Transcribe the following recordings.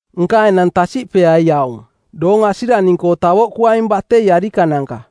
Nka enang tasiꞌpeai aung: Doong asiraning-koo tavoꞌkuaing batei arikananka.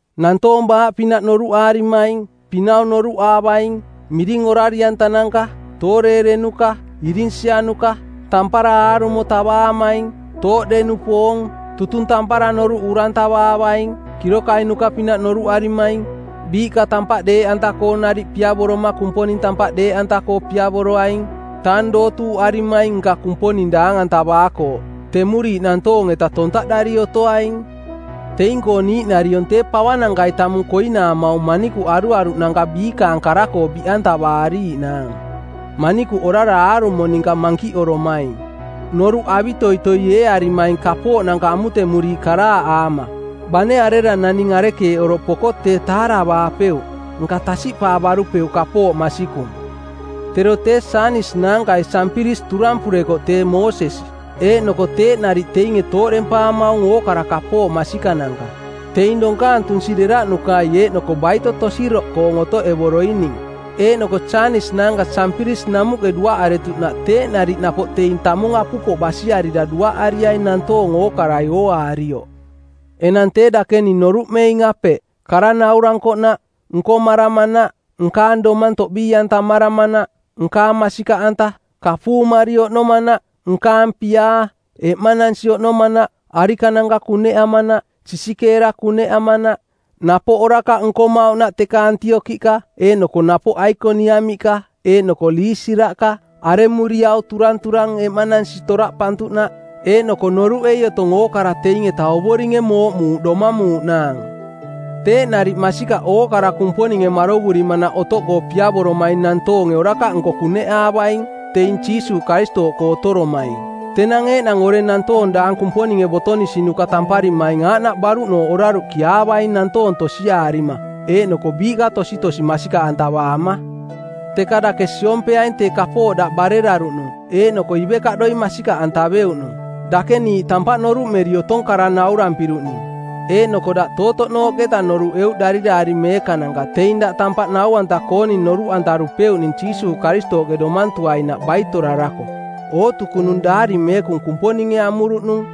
nantoong baaꞌpinaꞌ noruꞌaarimaing, pinau noruꞌaavaing, miring orari-antananka, tooreerenuka, irinsianuka, tampara aarumo tavaamaing, tooꞌde-nupoong, tutung tampara noruꞌ uraantavaavaing, kirokainuka-pinaꞌ noruꞌarimaing, biiꞌka tampaꞌ deeꞌanta-koo nariꞌ piavoroma Kumponing tampaꞌ deeꞌanta-koo piavoroaing, tang dootuuꞌarimaing nka Kumponing daang-antavaakooꞌ; Temuriiꞌ nantoong-eta tontaꞌdari otoaing. Teing-koo niiꞌnariong tee pavanankai tamung koinaamaung manikuꞌ aruaruꞌnanka biikaang kara-koo biꞌantavaariiꞌnaang, manikuꞌ orara aarumo ninka mankiꞌoromaing, noruꞌ avitoitoi eearimaing kapooꞌnanka amutemuriiꞌ karaaꞌaama. Bane arera naning arekeeꞌ oroꞌ poko tee taaravaapeuꞌ, nka tasiꞌpaavarupeuꞌ kapooꞌ masikung. Tero tee Janis naankai Jampiris turampurekoꞌ tee Moosesi, eeꞌnoko teeꞌ nariꞌ teinge tooꞌdempaamaung ookara kapooꞌ masikananka. Teing donkaang tunsi deraꞌnukai eeꞌnoko baito tosiroꞌkoong otoꞌevoroining. Eeꞌnoko Janis naanka Jampiris namuꞌke duaꞌaretuꞌnaꞌ teeꞌ nariꞌ napoꞌ teing tamung apupoꞌ basiarira duaꞌariaing nantoong ookarai ooaarioꞌ. Enang tee dake ning noruꞌmeing apeꞌ: kara nauarankoꞌnaꞌ, nkomaramanaꞌ, nkaang domang toꞌbii-antamaramanaꞌ, nkaang masikaꞌanta, kapuumari oꞌnomanaꞌ, nkaang piaa, eꞌmanansi oꞌnomanaꞌ, arikananka kuneꞌamanaꞌ, sisikeera kuneꞌamanaꞌ, napoꞌ orakaꞌ nkomauꞌnaꞌ teka Antiokiꞌka eeꞌnoko napoꞌ Aikoniamiꞌka eeꞌnoko Liisiraꞌka, aremuriau turanturang eꞌmanansi toraꞌpantuꞌnaꞌ; Eeꞌnoko noruꞌei otong ookara teing-eta Ovoringe mooꞌmuuꞌ domamuuꞌnaang. Teeꞌ nariꞌ masikaꞌ ookara Kumponinge marovurimanaꞌ otoꞌkoo piavoromaing nantoonge orakaꞌnko kuneꞌaavaing, teing Jiisuuꞌ Karistooꞌkoo otoromaing. Tenang eeꞌnang oreng nantoong daang Kumponinge botonisinuka tamparimaing aaꞌnaꞌ baruꞌnooꞌ oraruꞌkiaavaing nantoong tosiaarima eeꞌnoko biiꞌka tositosi masikaꞌantavaama. Teka dake siompeaing tee kapooꞌ daꞌ bareraruꞌnung eeꞌnoko ivekaꞌdoi masikaꞌantaveuꞌnung. Dake niiꞌ tampaꞌ noruꞌmeri otong kara naurampiruꞌning. Eeꞌnoko daꞌ tootoꞌnooꞌketa noruꞌeuꞌ Dariraari Meekananka teing daꞌ tampaꞌ nau-anta-kooning noruꞌantarupeuꞌning Jiisuuꞌ Karistooꞌke domantuainaꞌ baitorarako. Ootukunung Daari Meekung Kumponinge amuruꞌnung,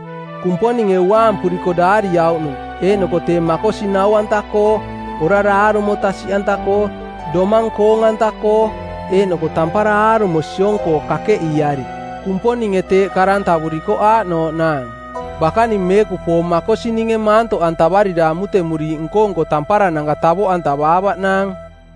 Kumponinge uaampuriko daariauꞌnung, eeꞌnoko tee makosi nau-anta-koo, orara aarumo tasiꞌanta-koo, domang koong-anta-koo, eeꞌnoko tampara aarumo siong-koo kakeꞌiiari. Kumponinge teeꞌ karantavurikoꞌ aaꞌnooꞌnaang: Bakaning meekupoong makosininge maantoꞌantavarira amutemuriiꞌ nko-nko tamparananka tavoꞌantavaavaꞌnaang.